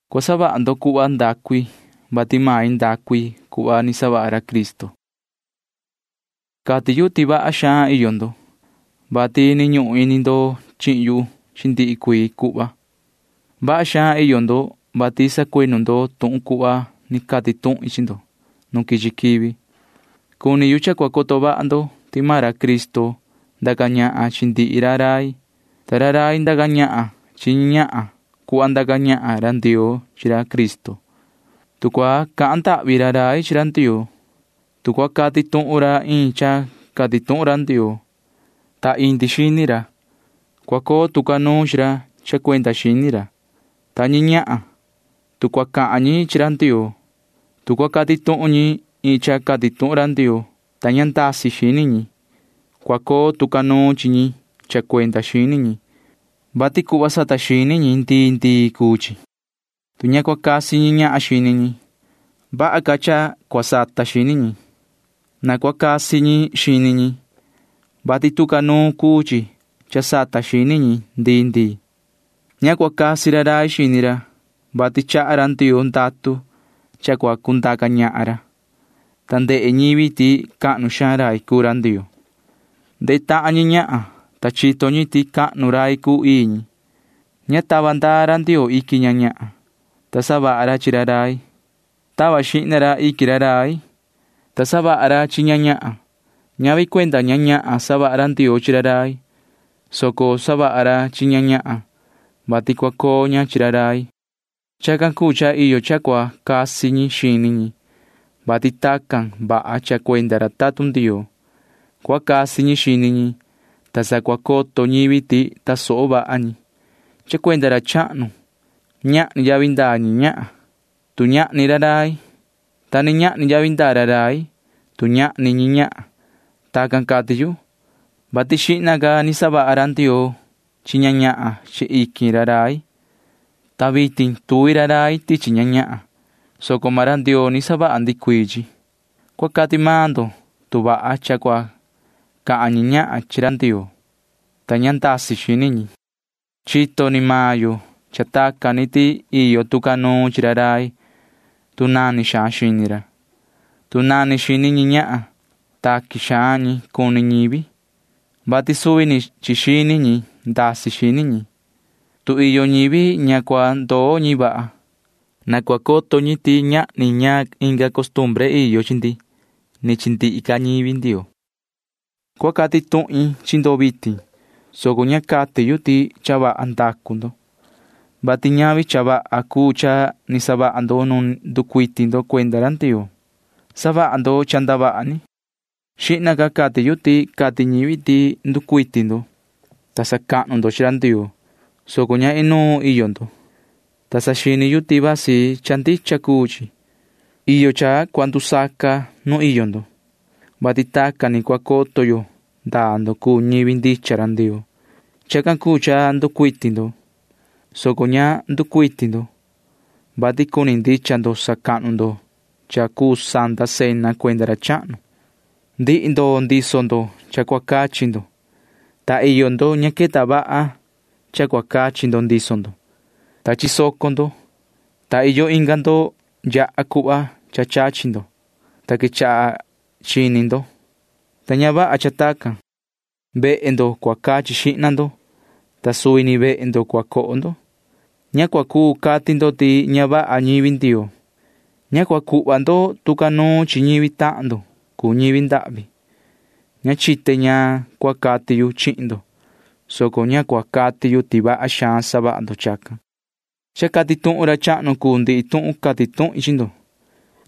Cua savaha ndo cuhva ndacu i, vati main ndacu i cuhva ni savaha ra Cristo. Cati yu ti vaha xaan iyo ndo, vati ni ñuhun ini ndo chihin yu chi ndihi cuii cuhva. Vaha xaan iyo ndo, vati sacuinu ndo tuhun cuhva ni cati tuhin chi ndo nu quichi quivi. Cuni yu cha cua coto vaha ndo ti maan ra Cristo ndaca ñahan chi ndihi ra rai, ta ra rai ndaca ñahan chi ñi ñahan cuhva ndaca ñahan ra Ndioo chi ra Cristo. Tu cua cahan ndahvi ra rai chi ra Ndioo, tu cua cati tuhun ra iin cha cati tuhun ra Ndioo, ta indi xini ra, cua coo tu ca nuun chi ra cha cuenda xini ra, ta ñi ñahan―tu cua cahan ñi chi ra Ndioo, tu cua cati tuhun ñi iin cha cati tuhun ra Ndioo, ta ña ndasi xini ñi, cua coo tu ca nuun chi ñi cha cuenda xini ñi, vati cuhva sata xini ñi ndii ndii cuu chi. Tu ña cua casi ñi ñahan xini ñi, vaha cha cua sata xini ñi. Na cua casi ñi xini ñi, vati tu ca nuun cuu chi cha sata xini ñi ndii ndii. Ña cua casi ra rai xini ra, vati chaha ra Ndioo ndatu cha cua cundaca ñahan ra, ta ndehe ñivi ti cahnu xaan rai cuu ra Ndioo. Ndehe tahan ñi chi ñi ñahan, ta chito ñi ti cahnu rai cuu ii ñi. Ña tava ra Ndioo iquin ña ñahan, ta savaha ra chi ra rai. Tava xihna ra iquin ra rai, ta savaha ra chi ña ñahan. Ñavi cuenda ña ñahan savaha ra Ndioo chi ra rai, soco savaha ra chi ña ñahan, vati cua coo ña chi ra rai. Chacan cuu cha iyo cha cua casi ñi xini ñi, vati tacan vaha cha cuenda ra tatun Ndioo. Cua casi ñi xini ñi, ta sa cua coto ñivi ti tasoho vaha ñi. Cha cuenda ra chahnu―ñahni yavi ndaa ñi ñahan, tu ñahni ra rai, ta ni ñahni yavi ndaa ra rai, tu ñahni ñi ñahan. Tacan cati yu, vati xihna ca ni savaha ra Ndioo chi ña ñahan chi iquin ra rai, ta vitin tuvi ra rai tichi ñi ñahan, soco maan ra Ndioo ni savaha ndihi cuii chi. Cua cati maan ndo tu vaha cha cua cahan ñi ñahan chi ra Ndioo, ta ña ndasi xini ñi. Chito ni maan yo cha tacan ni ti iyo tu ca nuun chi ra rai, tu nani xaan xini ra. Tu nani xini ñi ñahan, taqui xaan ñi cuni ñivi, vati suvi ni chi xini ñi ndasi xini ñi. Tu iyo ñivi ña cua ndoo ñi vaha, na cua coto ñi ti ñahni ñaan inga costumbre iyo chi ndi ni chi ndihi ca ñivi Ndioo. Cua cati tuhin chi ndo vitin, soco ña cati yu ti cha vaha ndacu ndo, vati ñavi cha vaha cuu cha ni savaha ndo nu nducuiti ndo cuenda ra Ndioo. Savaha ndo cha ndavaha ni. Xihna ca cati yu ti cati ñivi ti nducuiti ndo, ta sacahnu ndo chi ra Ndioo, soco ña inuun iyo ndo, ta saxini yu ti vasi cha ndicha cuu chi. Iyo cha cua ndusaca nu iyo ndo, vati tacan ni cua coto yo ndaa ndo cuu ñivi ndicha ra Ndioo. Chacan cuu cha nducuiti ndo, soco ña nducuiti ndo, vati cuni ndicha ndo sacahnu ndo cha cuu santa cena cuenda ra chahnu. Ndihi ndo ndiso ndo cha cua cachi ndo, ta iyo ndo ña queta vaha cha cua cachi ndo ndiso ndo, ta chisoco ndo, ta iyo inga ndo yaha cuhva cha chachi ndo, ta quechaha chini ndo, [ta ña vaha cha tacan]. Vehe ndo cua cachi xihna ndo, ta suvi ni vehe ndo cua coho ndo. Ña cua cuu cati ndo ti ña vaha ñivi Ndioo. Ña cua cuhva ndo tu ca nuun chi ñivi tahan ndo cuu ñivi ndahvi. Ña chite ñaan cua cati yu chihin ndo, soco ña cua cati yu ti vaha xaan savaha ndo chacan. Cha cati tuhun ra chahnu cuu ndihi tuhun cati tuhin chi ndo.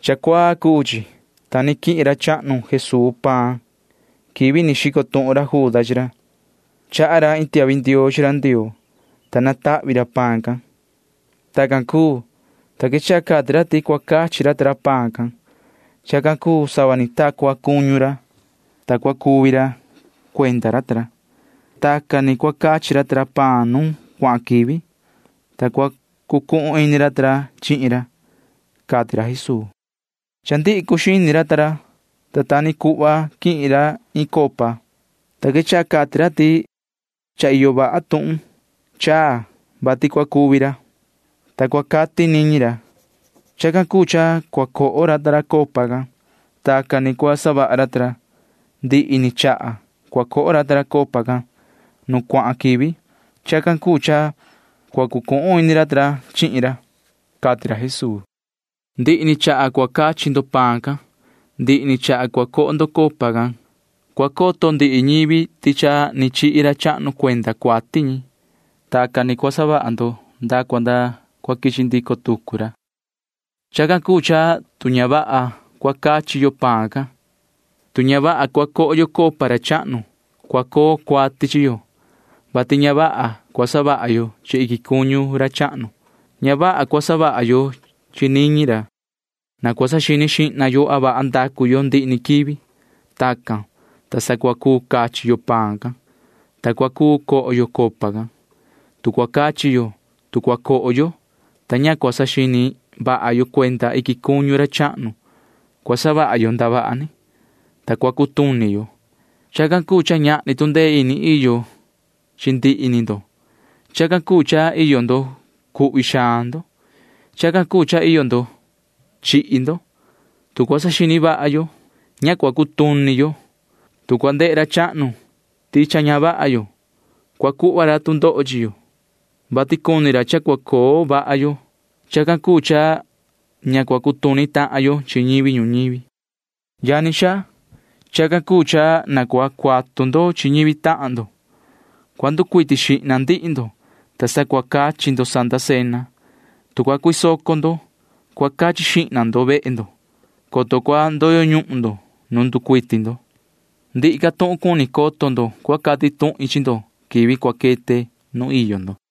Cha cuaa cuu chi, ta ni quihin ra chahnu Jesuu paan quivi ni xico tuhun Juda chi ra. Chaha ra iin tiahvi ndioo chi ra Ndioo, ta natahvi ra paan can. Tacan cuu, ta quechaha cati ra ti cua cachi ra ta ra paan can. Chacan cuu sava ni ta cua cuñu ra, ta cua cuvi ra cuenda ra ta ra. Tacan ni cua cachi ra ta ra paan nu cuahan quivi, ta cua cucuhun ini ra ta ra chihin ra, cati ra Jesuu. Cha ndihi cuxini ra, ta ta ni cuhva quihin ra iin copa, ta quechaha cati ra ti cha iyo vaha tuhun chaa, vati cua cuvi ra, ta cua cati niñi ra. Chacan cuu cha cua coho ra ta ra copa can. Tacan ni cua savaha ra ta ra ndihi ni chaha cua coho ra ta ra copa can nu cuahan quivi. Chacan cuu cha cua cucuhun ini ra ta ra chihin ra, cati ra Jesuu. Ndihi ni chaha cua cachi ndo paan can, ndihi ni chaha cua coho ndo copa can cua coto ndihi ñivi ti cha ni chihi ra chahnu cuenda cuati ñi. Tacan ni cua savaha ndo nda cua nda cua quichi ndico tucu ra. Chacan cuu cha tu ña vaha cua cachi yo paan can, tu ña vaha cua coho yo copa ra chahnu, cua coo cuati chi yo, vati ña vaha cua savaha yo chi iquin cuñu ra chahnu. Ña vaha cua savaha yo chi niñi ra. Na cua saxini xihna yo a vaha ndacu yo ndihi ni quivi. Tacan, ta sa cua cuu cachi yo paan can, ta cua cuu coho yo copa can. Tu cua cachi yo, tu cua coho yo, ta ña cua saxini vaha yo cuenda iquin cuñu ra chahnu, cua savaha yo ndavaha ni, ta cua cutuni yo. Chacan cuu cha ñahni tu ndee ini iyo chi ndihi ni ndo. Chacan cuu cha iyo ndo cuhvi xaan ndo. Chacan cuu cha iyo ndo chihi ndo. Tu cua saxini vaha yo, ña cua cutuni yo. Tu cua ndehe ra chahnu ti cha ña vaha yo, cua cuhva ra tu ndoho chi yo, vati cuni ra cha cua coo vaha yo. Chacan cuu cha ña cua cutuni tahan yo chi ñivi ñuñivi. Yani xaa, chacan cuu cha na cua cuatu ndo chi ñivi tahan ndo. Cua nducuiti xihna ndihi ndo, ta sa cua cachi ndo santa cena. Tu cua cuisoco ndo, cua cachi xihna ndo vehe ndo, coto cua ndoyo ñuhun ndo nu nducuiti ndo. Ndihi ca tuhun cuni coto ndo cua cati tuhin chi ndo quivi cua quete nu iyo ndo.